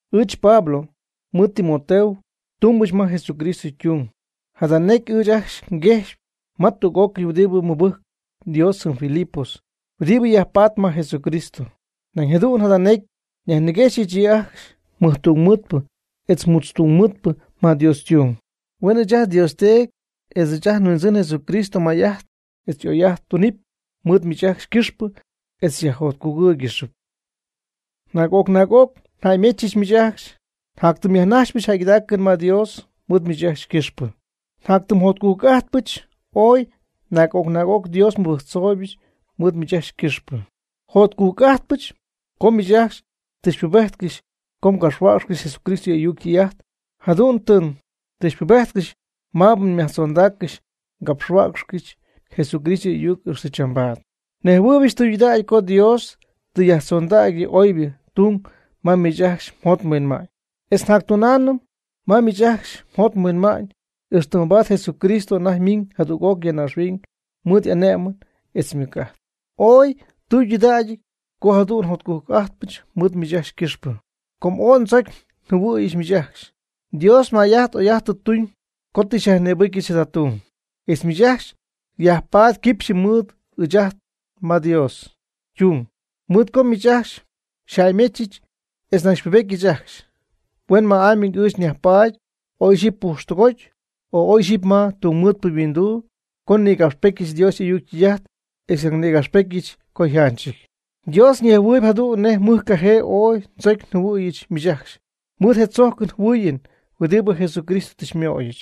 Ɨɨch Pablo mɨɨd Timoteo tumbɨch ma Jesucristo ytung. Jada necy ɨɨch ajcxy nguejxpy ma tüg'ócɨy huɨdibɨ mɨbɨjcp Dios jɨm Filipos huɨdibɨ yajpaatp ma Jesucristo. Nañ jadu'n jada necy nyajniguexyɨch yɨ' ajcxy mɨjtungmɨɨdpɨ etz mutztungmɨɨdpɨ ma Dios ytung. Huen ɨɨch ajt nDios Teedy etz ajt nHuindzɨn Jesucristo may'ajt etz oy'ajt tunɨpy mɨɨd miich ajcxy ycɨxpɨ etz xyajjotcugɨ́ɨygɨxɨpy. Naag'oc naag'oc njäymechɨch miich ajcxy njatytimyajnajxpyɨch jäygɨdaacɨn ma Dios mɨɨd miich ajcxy ycɨxpɨ. Njatytimjotcujc'ajtpɨch ooy naag'oc naag'oc Dios nmɨbɨjctzooyɨch mɨɨd miich ajcxy ycɨxpɨ. Jotcujc'ajtpɨch com miich ajcxy tɨ xypubéjtcɨxyɨch co ngapxhuäcxɨch Jesucristo y'ayuc ytɨy'ajt. Jadu'n tɨ xypubéjtcɨxyɨch maabɨ nyajtzondägyɨch ngapxhuäcxyɨch Jesucristo y'ayuc ixtɨ chambaad. Nejhuɨɨybɨch tɨydudägy co Dios tɨ yajtzondägy yɨ oybɨ ytung ma miich ajcxy mjot mhuinma'ñ, etz jactunaamnɨ ma miich ajcxy mjot mhuinma'ñ ixtɨ mabaad Jesucristo anajty ymiiñ jadüg'oc ya naaxhuiñ mɨɨd y'ane'mɨn etz ymɨc'ajt. Ooy ytudägyɨty co jadu'n jotcujc'ajtpɨch mɨɨd miich ajcxy ycɨxpɨ, com ooy ndzocy njɨhuɨ̈yɨch miich ajcxy. Dios may'ajt oy'ajt tɨ tuñ co tɨ xyajnïbɨcyɨch jada tung, etz miich ajcxy myajpaady quipxy mɨɨd ɨɨch ma Dios ytung, mɨɨd co miich ajcxy xyjäymechɨch etz nañ xypubetyɨch ajcxy, huenma'amy ɨɨch nyajpaady, oy ixyipy pujxtɨgoty, oy ixyipy ma tungmɨɨdpɨ yhuinduu co nnïgapxpetyɨch Dios y'ayuc ytɨy'ajt etz nañ nnïgapxpetyɨch co yjanchɨty. Dios ñejhuɨɨyb jadu'n nej mɨjcajee ooy ndzocy njɨhuɨ̈yɨch miich ajcxy mɨɨd je tzojcɨn jɨhuɨɨyɨn huɨdibɨ Jesucristo tɨ xymöyɨch.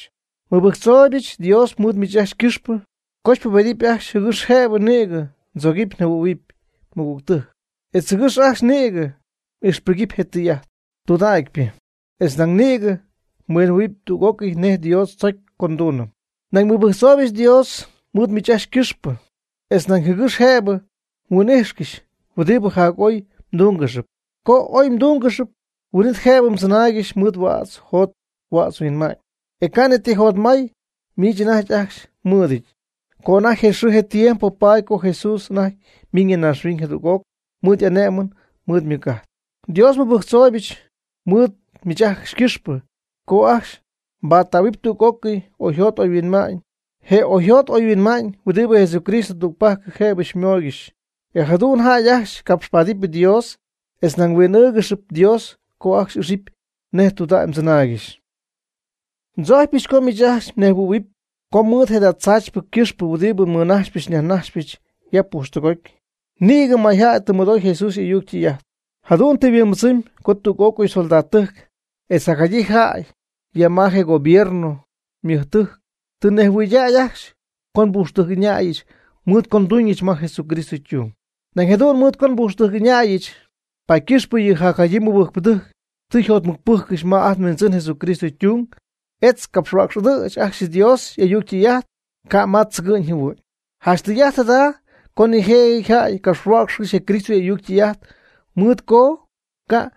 Nmɨbɨjctzooybɨch Dios mɨɨd miich ajcxy ycɨxpɨ co xypubedɨpy ajcxy jɨgɨx jëbɨ nïgɨ mdzogɨpy mjɨhuɨ̈huɨpy mɨgügtɨjc, etz jɨgɨx ajcxy nïgɨ m'ixpɨgɨpy je tɨy'ajt tudägypɨ, etz nañ nïgɨ mhuinjɨhuɨ̈huɨpy tüg'ócɨy nej Dios tzocy co nduunɨm. Nañ nmɨbɨjctzooybɨch Dios mɨɨd miich ajcxy ycɨxpɨ jɨgɨx jëbɨ mnejhuɨ́ɨygɨxɨpy, etz nañ jɨgɨx jëbɨ mhuin'íjxcɨxɨpy huɨdibɨ jac'oy mdúnggɨxɨpy. Co oy mdúngɨxɨpy, huin'it jëbɨ mdzɨnáaygɨxy mɨɨd huädz jot huädz huinma'ñ, e ca' ni ti jotmay miich anajty ajcxy mmɨɨdɨñ, co anajty je xɨɨ je tiempo paady co Jesús anajty miñ ya naaxhuiñ jadüg'oc mɨɨd y'ane'mɨn mɨɨd ymɨc'ajt. Dios nmɨbɨjctzooybɨch mɨɨd miich ajcxy ycɨxpɨ co ajcxy mbattähuɨp tüg'ócɨy oyjot oyhuinma'ñ, je oyjot oyhuinma'ñ huɨdibɨ Jesucristo tügpajc jëbɨ xymooygɨxy. E jadu'n jäy ajcxy capxpaadɨp Dios etz nañ huin'ɨ́ɨgɨxɨp Dios co ajcxy ixɨpy nej tudägy mdzɨnaaygɨxy. Ndzojcpyɨch co miich ajcxy mnejhuɨ̈huɨpy co mɨɨd je tzaachypɨ ycɨxpɨ huɨdibɨ nmɨnaxyp nyajnaxypɨch ya pujxtɨgoty, nïgɨ mayjäy tɨ mɨdoy Jesús y'ayuc ytɨy'ajt. Jadu'n tɨ yhuimbɨdzɨmy co tüg'ócɨy soldadtɨjc etz jacjadyii jäy ya ma je gobierno ymɨjtɨjc tɨ nejhuɨɨydäy ajcxy co nbujxtɨjc'ɨñayɨch mɨɨd co nduuñɨch ma Jesucristo ytung. Nañ jadu'n mɨɨd co nbujxtɨjc'ɨñäyɨch, paady ycɨxpɨ yɨ jacjadyii mɨbɨjcpɨdɨjc tɨ yjotmɨcpɨjccɨxy ma ajt nHuindzɨn Jesucristo tung, etz ycapxhuäcxy'adɨɨchpy ajcxy Dios y'ayuc ytɨy'ajt, ca' ma tzɨgɨ'ñ jɨhuɨ'ñ. Janch tɨy'ajt jada co nijëjɨty jäy capxhuäcxy je Cristo y'ayuc ytɨy'ajt mɨɨd co ca'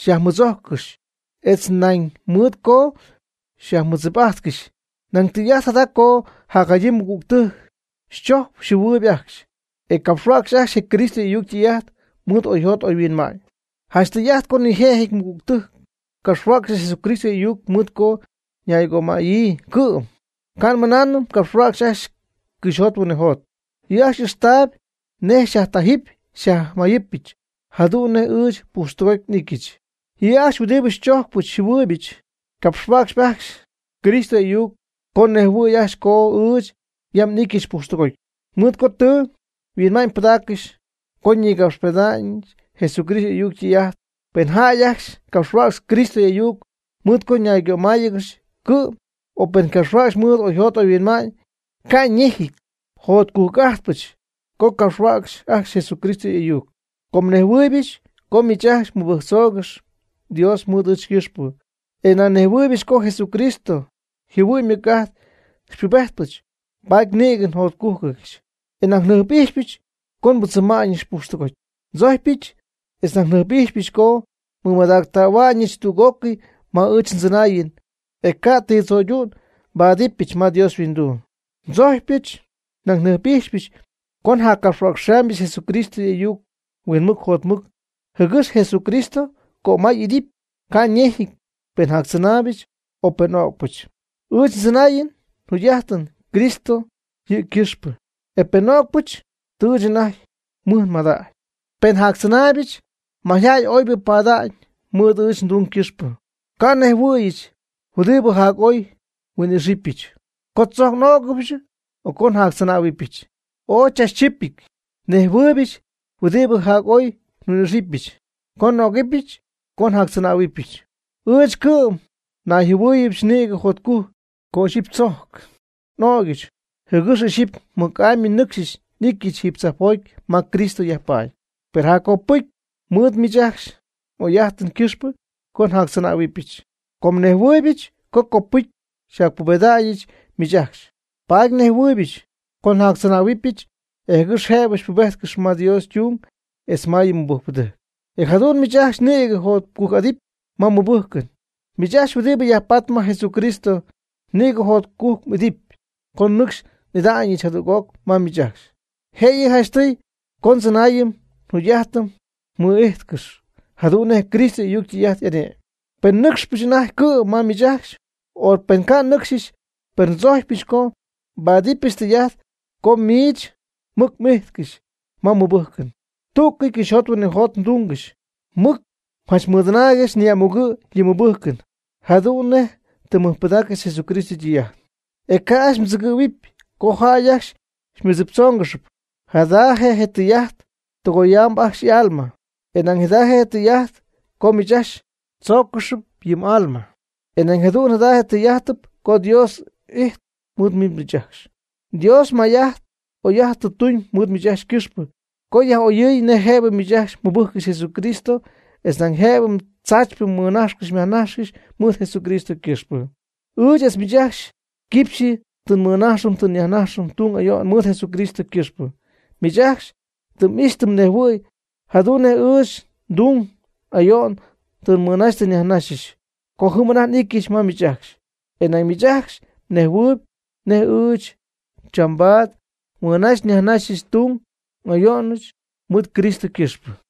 xyajmɨdzojccɨxy, etz nañ mɨɨd co xyajmɨdzip'ajtcɨxy. Nañ tɨy'ajt jada co jacjadyii mɨgügtɨjc xychojcp xyjɨhuɨɨyb ajcxy, e capxhuäcxy ajcxy je Cristo y'ayuc ytɨy'ajt mɨɨd oyjot oyhuinma'ñ. Janch tɨy'ajt co nijëjɨty mɨgügtɨjc capxhuäcxcɨxy Jesucristo y'ayuc mɨɨd co ñaygömaya'ñyii cɨ'm, ca' nmɨnaanɨm ycapxhuäcxp ajcxy cɨxyjot huinɨjot. Yɨ' ajcxy y'ixtaayb nej xyajtajɨ́py xyajmayɨ́pyɨch, jadu'n nej ɨɨch pujxtɨgoty n'ityɨch. Yɨ' ajcxy huɨdibɨ xychojcpɨch xyjɨhuɨɨybɨch ycapxhuäcxpy ajcxy Cristo y'ayuc com ñejhuɨɨyb ajcxy co ɨɨch yam n'ityɨch pujxtɨgoty, mɨɨd co tɨ nhuinma'ñ nbɨdägyɨch co nnïgapxpeda'ñɨch Jesucristo y'ayuc ytɨy'ajt. Pen jäy ajcxy capxhuäcxp Cristo y'ayuc mɨɨd co ñaygömayáanɨgɨxy cɨ'm, o pen ycapxhuäcxyp mɨɨd oyjot oyhuinma'ñ, ca' ñejɨty, jotcujc'ajtpɨch co capxhuäcxy ajcxy Jesucristo y'ayuc. Com nnejhuɨɨybɨch co miich ajcxy mmɨbɨjctzoogɨxy Dios mɨɨd ɨɨch ycɨxpɨ, e nañ nnejhuɨɨybɨch co Jesucristo yjɨhuɨ'ñ ymɨc'ajt xypubetyɨch, paady nïgɨ njotcugɨ̈yɨch, e nañ njɨjp'ijxypɨch co nbɨdzɨma'ñɨch pujxtɨgoty. Ndzojcpyɨch etz nañ njɨjp'ijxpyɨch co nmɨmadactähua'ñɨch tüg'ócɨy ma ɨɨch mdzɨnaayɨn, e ca' ti tzöydu'n nbáadɨbɨch ma Dios yhuinduu. Ndzojcpyɨch nañ njɨjp'ijxpyɨch co njaccapxhuäcxɨbɨch Jesucristo y'ayuc huinmɨc jotmɨc, jɨgɨx Jesucristo ycömay'idɨpy. Ca' ñejɨty pen jactzɨnaayb, o pen n'o'cpɨch. Ɨɨch ndzɨnaayɨn njuugy'ajtɨn Cristo yɨ' ycɨxpɨ, e penɨ n'o'cpɨch, tɨ ɨɨch anajty mɨj nmadägy. Pen njactzɨnaaybɨch, mayjäy oybɨ pada'ñ mɨɨd ɨɨch ndung ycɨxpɨ. Ca' nnejhuɨ̈yɨch huɨdibɨ jac'oy nhuin'ixɨpyɨch co tzojc n'ögɨbɨch, o co njactzɨnähuɨbɨch. Ooy chachchipɨty nnejhuɨ̈huɨbyɨch huɨdibɨ jac'oy nhuin'ixɨpyɨch, co n'ögɨbyɨch, o co njactzɨnähuɨbyɨch. Ɨɨch cɨ'm nayjɨhuɨ̈yiijɨch nïgɨ jotcujc co ixyipy tzojc n'ögyɨch, jɨgɨx ixyipy mɨc'amy nɨcxy n'ityɨch jiiby tzajpjoty ma Cristo yajpaady. Per jaccopɨty mɨɨd miich ajcxy m'oy'ajtɨn ycɨxpɨ, co njactzɨnähuɨbɨch. Com nnejhuɨɨybɨch co copɨcy njacpubeda'ñɨch miich ajcxy, paady nnejhuɨɨybɨch co njactzɨnähuɨbɨch, e jɨgɨx jëbɨ nbubejtcɨxy ma Dios ytung etz ma yɨ mmɨbɨjcɨn. E jadu'n miich ajcxy nïgɨ mjotcujc'adɨpy ma mmɨbɨjcɨn. Miich ajcxy huɨdibɨ yajpaatp ma Jesucristo, nïgɨ jotcujc m'idɨpy co nɨcxy n'ida'ñɨch jadüg'oc ma miich ajcxy. Jëyɨ janchtɨy co mdzɨnaayɨn mjugy'ajtɨn mɨ'ijtcɨxy jadu'n nej Cristo y'ayuc ytɨy'ajt y'ane'my. Pen nɨcxpɨch anajty cɨ'm ma miich ajcxy, o pen ca' nnɨcxyɨch, per ndzojcypɨch co xypáadɨbɨch tɨy'ajt co miich mɨc m'ijtcɨxy ma mmɨbɨjcɨn, tú'cɨy cɨxyjot huinɨjot mdungɨxy. Mɨc mjanchmɨdɨnaaygɨxy ni'amugɨ' yɨ mmɨbɨjcɨn, jadu'n nej tɨ mmɨjpɨdaaccɨxy Jesucristo ytɨy'ajt, e ca'ajcxy mdzɨgɨ̈huɨp co jäy ajcxy xymɨdziptzóongɨxɨpy, jada je' tɨy'ajt co tɨgoyamb ajcxy y'alma, e nañ jada je' tɨy'ajt co miich ajcxy chóocɨxɨpy yɨ m'alma, e nañ jadu'n jada tɨy'ajtɨp co Dios y'ity mɨɨd miich ajcxy. Dios may'ajt oy'ajt tɨ tuñ mɨɨd miich ajcxy ycɨxpɨ co yaj'oyɨɨy nej jëbɨ miich ajcxy mɨbɨjccɨxy Jesucristo etz nañ nej jëbɨ tzaachypɨ mmɨnajxcɨxy myajnajxcɨxy mɨɨd Jesucristo ycɨxpɨ. Ɨɨch etz miich ajcxy quipxyɨ tɨ nmɨnajxɨm tɨ nyajnajxɨm tung ayo'n mɨɨd Jesucristo ycɨxpɨ. Miich ajcxy tɨ m'ixy tɨ mnejhuɨ̈y jadu'n nej ɨɨch ndung n'ayo'n tɨ nmɨnaxy tɨ nyajnaxyɨch, co jɨm anajty n'ityɨch ma miich ajcxy. E nañ miich ajcxy mnejhuɨɨyb nej ɨɨch chambaad nmɨnaxy nyajnaxyɨch ndung n'ayo'nɨch mɨɨd Cristo ycɨxpɨ.